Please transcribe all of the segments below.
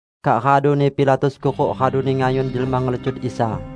Kak raduni Pilatus kuruk raduni ngayun jelma ngelecut Isa.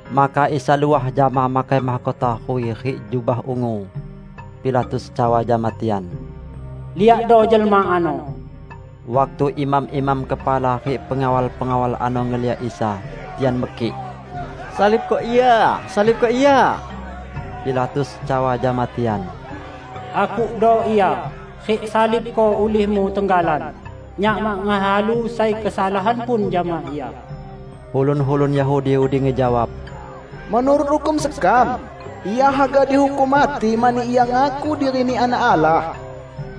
Maka Isa luah jama makai mahkota ruwi rik jubah ungu. Pilatus cawa jama tian, "Liakdo jelma ano." Waktu imam-imam kepala rik pengawal-pengawal ano ngeliak Isa, tian mekik, "Salibko Ia! Salibko Ia!" Pilatus cawa jama tian, "Akukdo Ia, rik salibko ulihmu tenggalan, nyak mak ngehalu sai kesalahan pun jama Ia." Ulun-ulun Yahudi udi ngejawab, "Menurut hukum sekam, Ia haga dihukum mati mani Ia ngaku diri-Ni Anak Allah."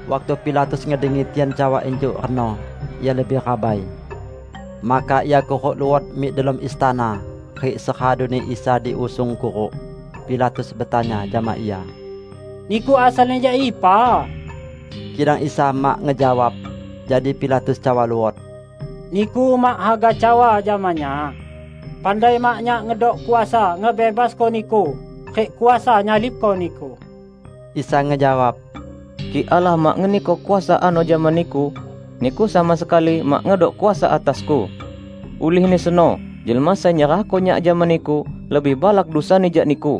Waktu Pilatus ngedengi tian cawa injuk reno, ia lebih rabai. Maka ia kuruk luot mik delom istana rik seraduni Isa diusung kuruk, Pilatus betanya jama Ia, "Niku asalni jak ipa?" Kidang Isa mak ngejawab. Jadi Pilatus cawa luot, "Niku mak haga cawa jama nyak? Pandai mak, nyak ngedok kuasa ngebebasko Niku, rik kuasa nyalibko Niku!" Isa ngejawab, "Kik Allah mak ngeniko kuasa ano jama niku, niku sama sekali mak ngedok kuasa atas-Ku. Ulihni seno jelma sai nyerahko Nyak jama niku, lebih balak dusani jak niku."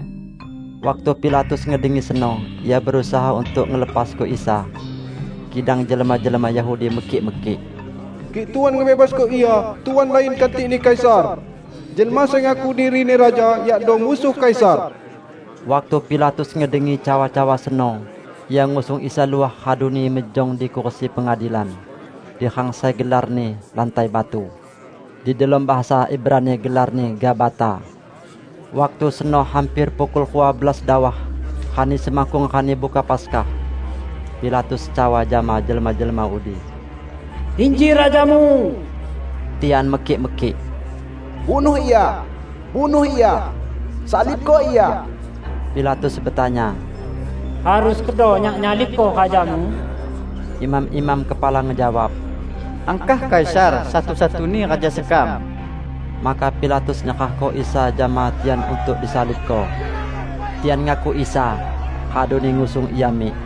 Waktu Pilatus ngedengi seno, ia berusaha untuk ngelepasko Isa. Kidang jelma-jelma Yahudi mekik-mekik, "Kik Tuan ngebebasko Ia, Tuan lain kantikni Kaisar! Jelma sai ngaku dirini raja, yakdo musuh Kaisar!" Waktu Pilatus ngedengi cawa-cawa seno, ia ngusung Isa luah raduni mejong di kursi pengadilan di rang sai gelarni Lantai Batu. (Di delom bahasa Ibrani gelarni Gabata.) Waktu seno hamper pukul rua belas dawah, rani semakkung Rani Buka Paskah. Pilatus cawa jama jelma-jelma udi, "Inji rajamu!" Tian mekik-mekik, "Bunuh Ia! Bunuh Ia! Salibko Ia!" Pilatus betanya, "Harus kedo nyak nyalibko rajamu?" Imam-imam kepala ngejawab, "Angkah Kaisar satu-satuni raja sekam!" Maka Pilatus nyerahko Isa jama tian untuk disalibko. Tian ngakuk Isa, raduni ngusung Ia mik.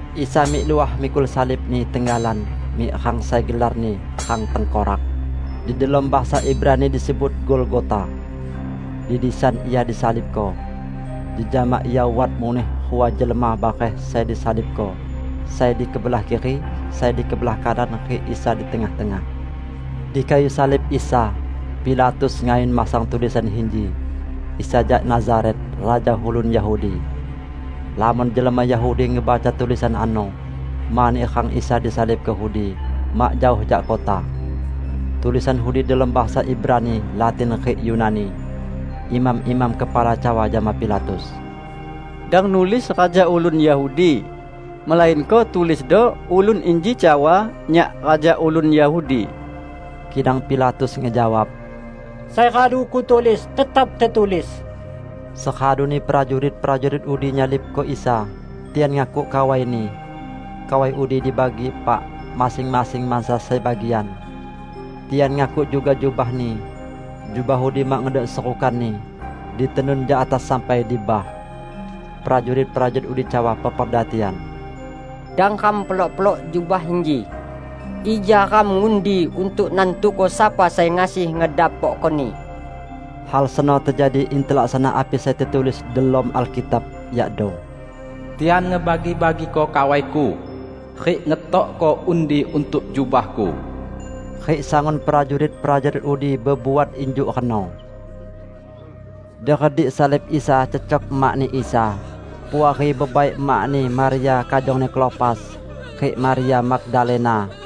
Isa mik luah mikul salib-Ni tenggalan mik rang sai gelarni "Rang Tengkorak". (Di delom bahasa Ibrani disebut Golgota.) Di disan Ia disalibko. Jejama Ia wat muneh rua jelma bareh sai disalibko; sai di kebelah kiri, sai di kebelah kanan rik Isa di tengah-tengah. Di kayu salib Isa, Pilatus ngayun masang tulisan inji: "Isa jak Nazaret, Raja Ulun Yahudi". Lamon jelma Yahudi ngebaca tulisan ano, mani rang Isa disalibko udi mak jaoh jak kota. Tulisan udi delom bahasa Ibrani, Latin, rik Yunani. Imam-imam kepala cawa jama Pilatus, "Dang nulis 'Raja ulun Yahudi', melainko tulisdo, 'Ulun inji cawa, Nyak Raja ulun Yahudi.' " Kidang Pilatus ngejawab, "Sai radu kutulis, tetap tetulis." Seraduni prajurit-prajurit udi nyalibko Isa, tian ngakuk kawai-Ni. Kawai udi dibagi epak: masing-masing mansa sai bagian. Tian ngakuk juga jubah-Ni. Jubah udi mak ngedok serukanni -- ditenun jak atas sampai di bah. Prajurit-prajurit udi cawa peperda tian, "Dang ram pelok-pelok jubah inji. Ija ram ngundi untuk nantuko sapa sai ngasi ngedapokkoni." Hal seno tejadi in telaksana api sai tetulis delom Alkitab, yakdo: "Tian ngebagi-bagiko kawai-Ku, rik ngetokko undi untuk jubah-Ku." Rik sangun prajurit-prajurit udi bebuat injuk reno. Di redik salib Isa cecok emak-Ni Isa, puari bebai emak-Ni, Maria kajongni Klopas, rik Maria Magdalena.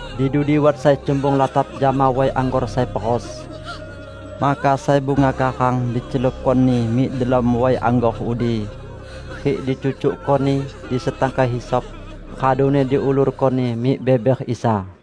Di dudi wat sai cumbung latap jama way anggor sai peros. Maka sai bunga karang dicelupkoni mik delom way anggor udi, rik dicucukkoni di setangkai hisop, raduni diulurkoni mik beber Isa.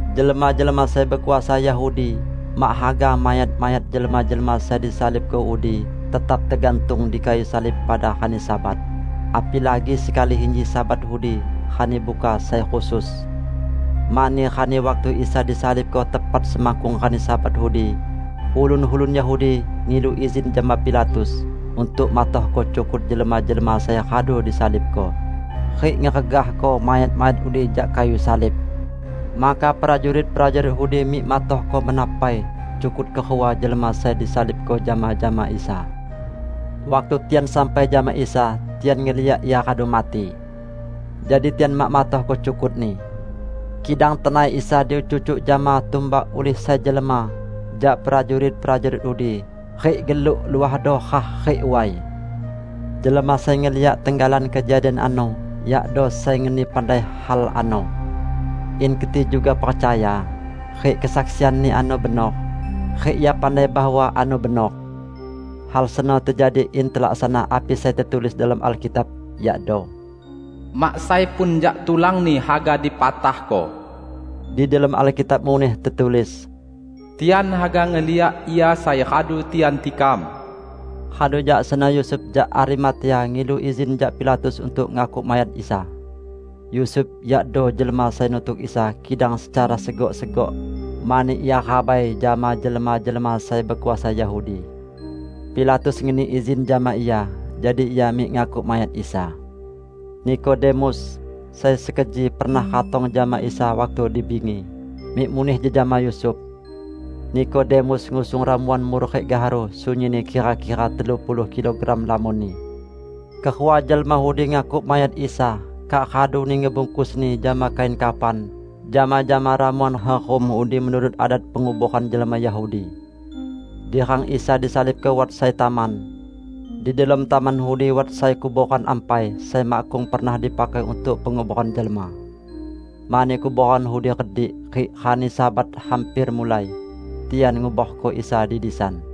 Jelma-jelma sai bekuasa Yahudi mak haga mayat-mayat jelma-jelma sai disalibko udi tetap tegantung di kayu salib pada rani Sabat, apilagi sekali inji Sabat udi Rani Buka sai khusus. Mani rani waktu Isa disalibko tepat semakkung rani Sabat udi, ulun-ulun Yahudi ngilu izin jama Pilatus untuk matohko cukut jelma-jelma sai radu disalibko rik ngeregahko mayat-mayat udi jak kayu salib. Maka prajurit-prajurit udi mik matohko mena pai cukut kerua jelma sai disalibko jama-jama Isa. Waktu tian sampai jama Isa, tian ngeliak Ia radu mati. Jadi tian mak matohko cukut-Ni. Kidang tenai Isa dicucuk jama tumbak ulih sai jelma jak prajurit-prajurit udi; rik geluk luahdo rah rik way. Jelma sai ngeliak tenggalan kejadian ano, yakdo sai ngeni pandai hal ano, in keti juga percaya. Rik kesaksianni ano benor, rik ia pandai bahwa ano benor. Hal seno tejadi in telaksana api sai tetulis delom Alkitab, yakdo "Mak sai pun jak tulan-Ni haga dipatahko". Di delom Alkitab muneh tetulis: "Tian haga ngeliak Ia sai radu tian tikam". Radu jak seno Yusuf jak Arimatea ngilu izin jak Pilatus untuk ngakuk mayat Isa. (Yusuf yakdo jelma sai nutuk Isa kidang secara segok-segok, mani ia rabai jama jelma-jelma sai bekuasa Yahudi.) Pilatus ngeni izin jama ia, jadi ia mik ngakuk mayat Isa. Nikodemus, sai sekeji pernah ratong jama Isa waktu di bingi, mik muneh jejama Yusuf. Nikodemus ngusung ramuan mur rik gaharu -- sunyinni kira-kira telu puluh kilogram lamonni. Kerua jelma udi ngakuk mayat Isa kak raduni ngebungkusni jama kain kafan jama-jama ramuan herum udi menurut adat penguboran jelma Yahudi. Di rang Isa disalibko wat sai taman. Di delom taman udi wat sai kuboran ampai, sai makkung pernah dipakai untuk penguboran jelma. Mani kuboran udi redik, rik rani Sabat hamper mulai, tian nguborko Isa di disan.